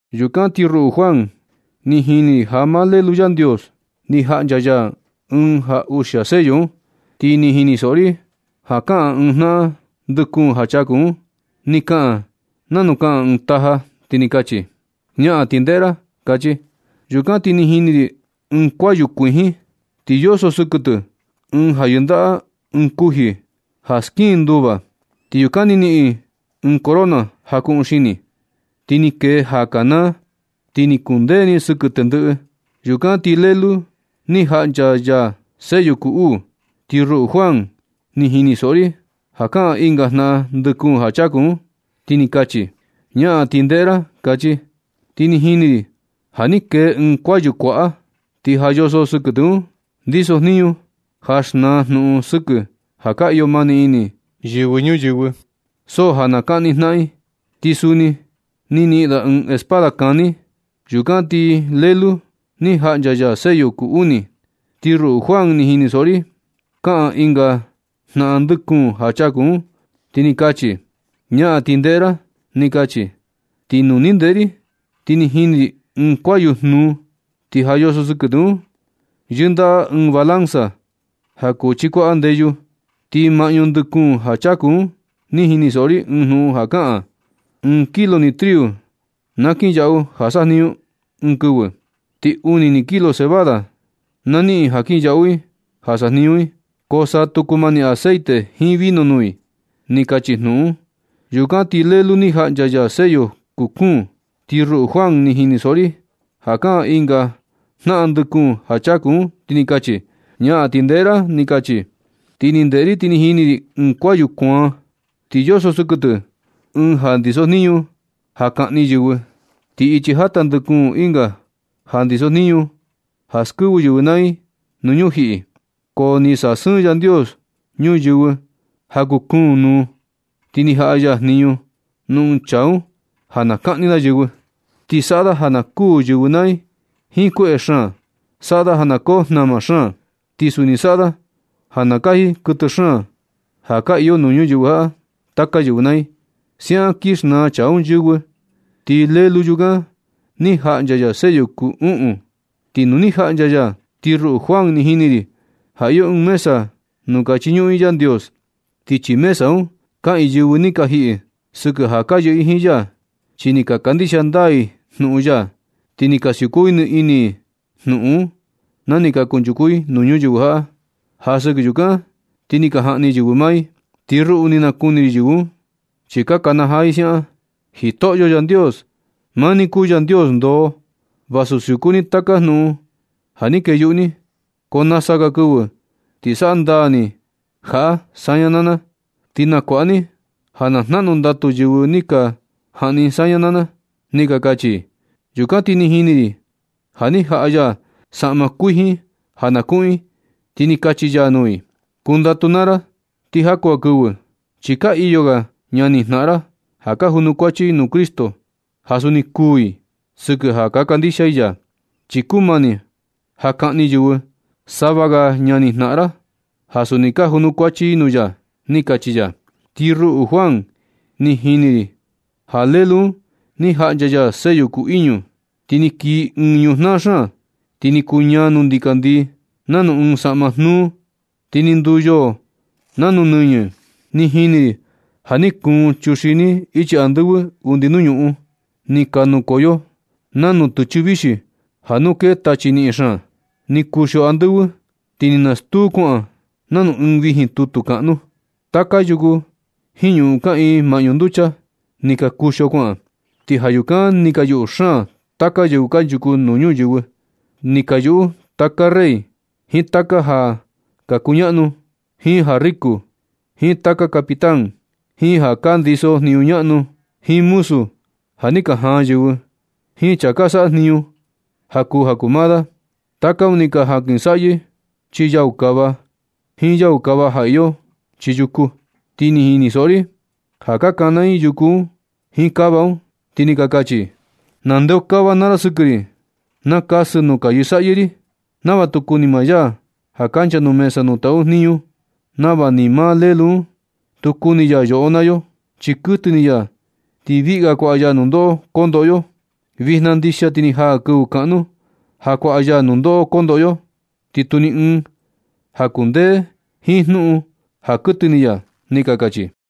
Yukan ti ruꞌu Juan, ni jini ri ja maa Lelu Yandios ni jaꞌncha ya ɨɨn ja uxia sello un. Ti ni jinisoꞌo ri ja kaꞌan ɨɨn jnaꞌan ndɨ kuun ja chaku un. Ni kaꞌan nanu kana ɨɨn taja, ti ni kachi: ―¡Ñaꞌan ti ndeꞌe ra! ―kachi. Yukan ti ni jini ri ɨɨn kuayu kuijin, ti yoso sɨkɨ tɨ ɨɨn ja yɨndaꞌa ɨɨn kuji ja skiꞌin nduva. Ti yukan ni niꞌin ɨɨn corona ja kuꞌun xini. Ti ni kee ja kanaa, ti ni kundee ni sɨkɨ tendɨꞌɨ. Yukan ti Lelu ni jaꞌncha ya sello kuu uu. Ti ruꞌu Juan, ni jinisoꞌo ri ja kaꞌan ɨnga jnaꞌan ndɨ kuun ja chaku un, ti ni kachi: ―¡Ñaꞌan ti ndeꞌe ra! ―kachi. Ti ni jini ri ja ni kee ɨɨn kuayu kuaꞌa, ti ja yoso sɨkɨ tɨ un ndisojniñu ja xnaa jnuꞌun sɨkɨ ja ka iyo mani ini yɨvɨ ñuyɨvɨ. So ja na kaꞌni jnaꞌan i. Ti suni ni niꞌin da ɨɨn espada kani. Yukan ti Lelu ni jaꞌncha ya sello kuu uni, ti ruꞌu Juan ni jinisoꞌo ri ja kaꞌan ɨnga jnaꞌan ndɨ kuun ja chaku un, ti ni kachi: ―¡Ñaꞌan ti ndeꞌe ra! ―ni kachi. Ti nu ni ndeꞌe ri ti ni jini ri ɨɨn kuayu jnuu. Ti ja yoso sɨkɨ tɨ un yɨndaꞌa ɨɨn balanza ja chikuaꞌa ndeyu. Ti maꞌñu ndɨ kuun ja chaku un ni jinisoꞌo ri ɨɨn jnuꞌun ja kaꞌan: ―Ɨɨn kilo ni triu na kinyaꞌu ja sajniñu i ɨɨn kɨvɨ. Ti uni ni kilo cebada na niꞌin i ja kinyaꞌu i ja sajniñu i. Ko sa tu kumani aceite jiin vino nuu i ―ni kachi jnuꞌun un. Yucan ti Lelu ni jaꞌncha ya sello kuu kuun. Ti ruꞌu Juan, ni jinisoꞌo ri ja kaꞌan ɨnga jnaꞌan ndɨ kuun ja chaku un, ti ni kachi: ―¡Ñaꞌan ti ndeꞌe ra! ―ni kachi. Ti ni ndeꞌe ri ti ni jini ri ɨɨn kuayu kuaan. Ti yoso sɨkɨ tɨ ɨɨn ja ndisojniñu ja kaꞌni yɨvɨ. Ti ichi jata ndikun ɨnga ja ndiso jniñu ja skɨvɨ yɨvɨ naa i nuu ñujiꞌi. Ko ni sasɨɨn Yandios ñuyɨvɨ ja kuu kuun nuu, ti ni jaꞌa ya jniñu nuu ɨɨn chaa un ja na kaꞌni da yɨvɨ. Ti saꞌa da ja na kuu yɨvɨ naa i jiin kueꞌe xaan. Saꞌa da ja koo jnama xaan. Ti suni saꞌa da ja na kaji kuɨtɨ xaan ja ka iyo nuu ñuyɨvɨ jaꞌa taka yɨvɨ naa i. Siaꞌan kin xnaa chaa un yɨvɨ. Ti Lelu yukan ni jaꞌncha ya sello kuu uꞌun. Ti nu ni jaꞌncha ya, ti ruꞌu Juan, ni jini ri ja iyo ɨɨn mesa nuu ka chiñuꞌun i Yandios. Ti chii mesa un kaꞌiin yɨvɨ ni ka jiꞌi sɨkɨ ja ka yɨꞌɨ i jiin ya. Chi ni ka kandixia ndaa i jnuꞌun ya, ti ni ka siuku ni ini i jnuꞌun un na ni kunchuku i nuu ñuyɨvɨ jaꞌa. Ja sɨkɨ yukan ti ni ka jaꞌni yɨvɨ maa i. Ti ruꞌu ni nakuni ri yɨvɨ un. Chi ka kanajaa i siaꞌan: ―¡Jitoꞌo Yandios! Maa ni kuu Yandios ndoo. Vaꞌa siuku ni taka jnuꞌun ja ni kee yuꞌu ni. Ko nasa ga kɨvɨ ti saꞌa ndaa ni jaꞌa saña naa na, ti nakuaꞌa ni ja na jnaꞌnu ndatu yɨvɨ ni ka jaꞌni saña naa na ―ni ka kachi i. Yukan ti ni jini ri ja ni jaꞌa ya saꞌma kuijin ja na kuꞌun i, ti ni kachi ya nuu i: ―Kundatu naa ra ti jaku ga kɨvɨ, chi ka iyo ga ñani jnaꞌan ra ja ka junukuachi i nuu Cristo, ja suni kuū i sɨkɨ ja ka kandixia i ya. Chi kumani ja kaꞌni yɨvɨ sava ga ñani jnaꞌan ra ja suni ka junukuachi i nuu ya ―ni kachi ya. Ti ruꞌu Juan, ni jini ri ja Lelu un, ni jaꞌncha ya sello kuu iñu. Ti ni kii ɨɨn ñujnaa xaan. Ti ni kuñaa nuu ndikandii nanu ɨɨn saꞌma jnuu. Ti ni nduu yoo nanu nɨñɨ. Ni jini ri ja ni kuun chuxini ichi andɨvɨ undi nuu ñuꞌun. Ni ka nukoyo nanu tɨchɨ vixi yɨꞌɨ ja nu kee tachi niꞌin xaan. Ni kuxio andɨvɨ ti ni nastuu kuaꞌan nanu ɨɨn vijin tutu kaꞌnu. Taka yuku jiin ñuꞌun kaꞌiin maꞌñu nducha, ni ka kuxio kuaꞌan. Ti ja yukan ni ka yuꞌu xaan taka yɨvɨ kanchuku nuu ñuyɨvɨ. Ni ka yuꞌu taka rey, jiin taka ja ka kuñaꞌnu, jiin ja riku, jiin taka capitán, jiin ja ka ndisojniñu ñaꞌnu, jiin muzu ja ni ka jaan yɨvɨ, jiin chaa ka saꞌa jniñu ja kuu ja kuu maa da. Taka un ni ka jankɨsaꞌyɨ chii yau kava jiin yau kava ja iyo chii yuku. Ti ni jinisoꞌo ri ja ka kana i yuku un jiin kava un, ti ni ka kachi i: ―Na ndeokava naa ra sɨkɨ ri. Na kasɨ nuu ka yɨsaꞌyɨ ri, nava tu kuni maa ya ja kancha nuu mesa nuu taꞌu ya jniñu, nava ni maa Lelu un tu kuni ya yoꞌo naa yo, chi kuɨtɨ ini ya ti viꞌga kuaꞌa ya nundoꞌo kondoꞌo yo. Vijna ndixia ti ni jaa kɨvɨ kaꞌnu ja kuaꞌa ya nundoꞌo kondoꞌo yo. Ti tu ni ɨɨn ja kundee jiin jnuꞌun ja kuɨtɨ ini ya ―ni ka kachi i.